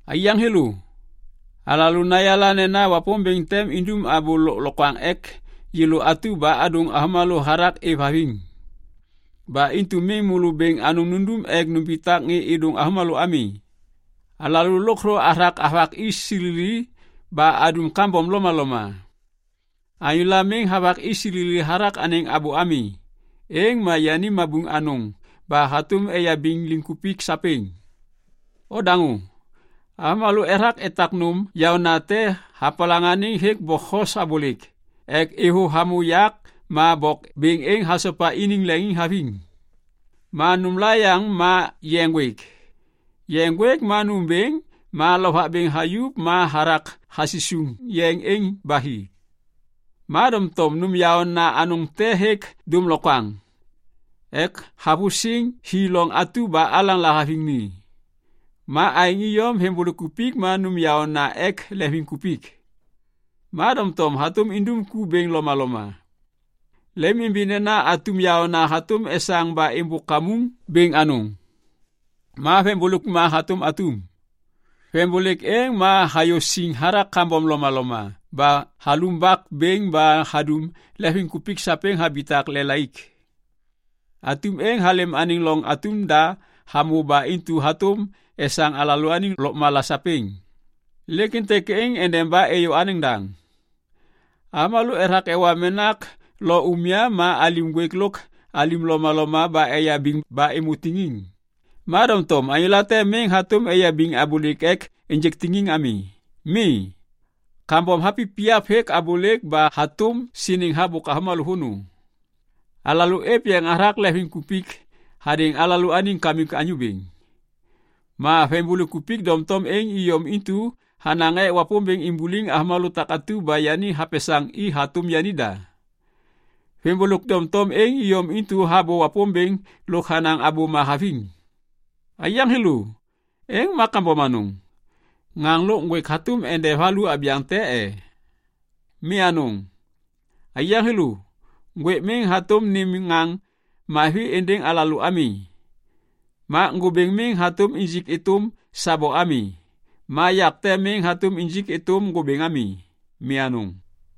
Aiyaŋ thêlô, alalô nayala nena Wapômbêŋ tem indum abô lôklokwaŋ ek yêlô atu ba adôŋ avômalô hathak êvhaviŋ. Ba intu miŋ môlô bêŋ anôŋ nundum ek numbitak ŋê êdôŋ avômalô ami. Alalô lôkthô athak avak i silili ba adum kambom lomaloma. Anyôla miŋ havak i silili hathak anêŋ abô ami, êŋ ma yani mabuŋ anôŋ ba hatôm eyabiŋ liŋkupik sapêŋ. Odaŋô. Avômalô ethak etak nôm yaônate hapalaŋaniŋ hêk bokhos abôlêk ek êvôv hamô yak ma bok bêŋ êŋ hasopa iniŋ leŋiŋhaviŋ. Ma nômla yaŋ ma yeŋ ŋgwêk. Yeŋ ŋgwêk ma nômbêŋ ma lovak bêŋ hayuv ma hathak hasisuŋ yeŋ êŋ ba hi. Ma doŋtom nôm yaôna anôŋ te hêk dômlokwaŋ ek havusiŋ hi loŋ atu ba alaŋ lahaviŋ ni. Ma aêŋ iyom veŋbôlêk ma nôm yaôna ek leŋviŋkupik. Ma doŋtom hatôm indum ku bêŋ lomaloma. Lemimimbi nena atum yaôna hatôm esaŋ ba êmbôk kamuŋ bêŋ anôŋ. Ma veŋbôlêk ma hatôm atum. Veŋbôlêk êŋ ma hayô siŋ hathak kambom lomaloma ba halumbak bêŋ ba hadum leŋviŋkupik sapêŋ habitak lelaik. Atum êŋ halêm anêŋ loŋ atum da hamô ba intu hatôm esaŋ alalôaniŋ lôkmala sapêŋ, lêk êntêk êŋ endeba êyô anêŋ daŋ. Avômalô ethak ewa menak lo umya ma alim ŋgwêk lôk alim lomaloma ba eyabiŋ ba êmô tiŋiŋ. Ma doŋtom anyô late miŋ hatôm eyabiŋ abôlêk ek ênjêk tiŋiŋ ami. Mi, kambom hapipiyap hêk abôlêk ba hatôm siniŋ habôk avômalô vônô. Alalô êv yeŋ hathak veŋiŋbôlêk hadêŋ alalôaniŋ Kamik Anyô Bêŋ. Ma veŋiŋbôlêk doŋtom êŋ iyom intu hanaŋ ek Wapômbêŋ imbuliŋ avômalô takatu ba yani hapesaŋ i hatôm yanida. Veŋiŋbôlêk doŋtom êŋ iyom intu habô Wapômbêŋ lôk hanaŋ abôma haviŋ. Aiyaŋ thêlô, êŋ ma kambom anôŋ. Ŋaŋ lôk ŋgwêk hatôm nede valu abyaŋ te e? Mi anôŋ. Aiyaŋ thêlô, ŋgwêk miŋ hatôm nêm ŋaŋ mavi êndêŋ alalô ami. Ma ŋgôbêŋ miŋ hatôm injik êtôm sabo ami. Ma yak te miŋ hatôm injik êtôm ŋgôbêŋ ami. Mi anôŋ.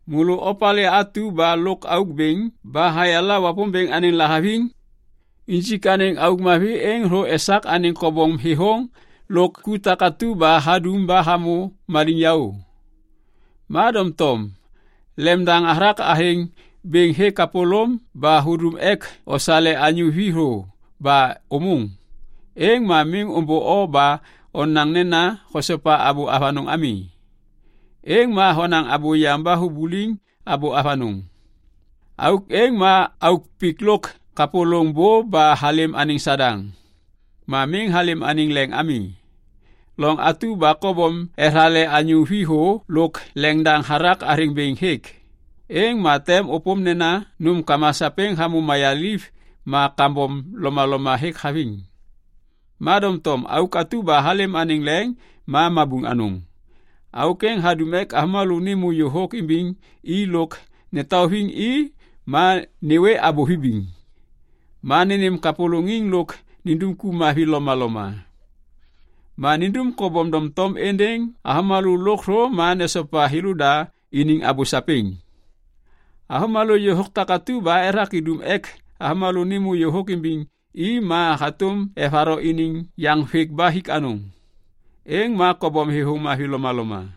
Môlô opalê atu ba lôkauk bêŋ ba hayala Wapômbêŋ anêŋ lahaviŋ? Injik anêŋ auk mavi êŋ thô esak anêŋ kobom thêthôŋ lôk ku takatu ba hadum ba hamô maliŋyaô. Ma doŋtom lemdaŋ hathak athêŋ bêŋ hêk kapôlôm ba hudum ek osale anyô vi thô ba ômôŋ, êŋ ma miŋ ômbô o ba onaŋ nena hosopa abô avanôŋ ami. Êŋ ma honaŋ abôyaŋ ba hubuliŋ abô avanôŋ. Auk êŋ ma auk pik lôk kapôlôŋ bô ba halêm anêŋ Sadaŋ. Ma miŋ halêm anêŋ leŋ ami. Loŋ atu ba kobom ethale anyô vi thô lôk leŋdaŋ hathak athêŋ bêŋ hêk, êŋ ma tem ôpôm nena nômkama sapêŋ hamô mayaliv ma kambom lomaloma hêk haviŋ. Ma doŋtom auk atu ba halêm anêŋ leŋ ma mabuŋ anôŋ. Auk êŋ hadum ek avômalô nêmô yôhôk imbiŋ i lôk netauviŋ i ma nêwê abô vibiŋ, ma nênêm kapôlôŋiŋ lôk nindum ku mavi lomaloma, ma nindum kobom doŋtom êndêŋ avômalô lôkthô ma nesopa thêlôda iniŋ abô sapêŋ. Avômalô yôhôk takatu ba ethak idum ek avômalô nêmô yôhôk imbiŋ i ma hatôm evatho iniŋ yaŋvêk ba hik anôŋ, êŋ ma kobom thêthôŋ mavi lomaloma.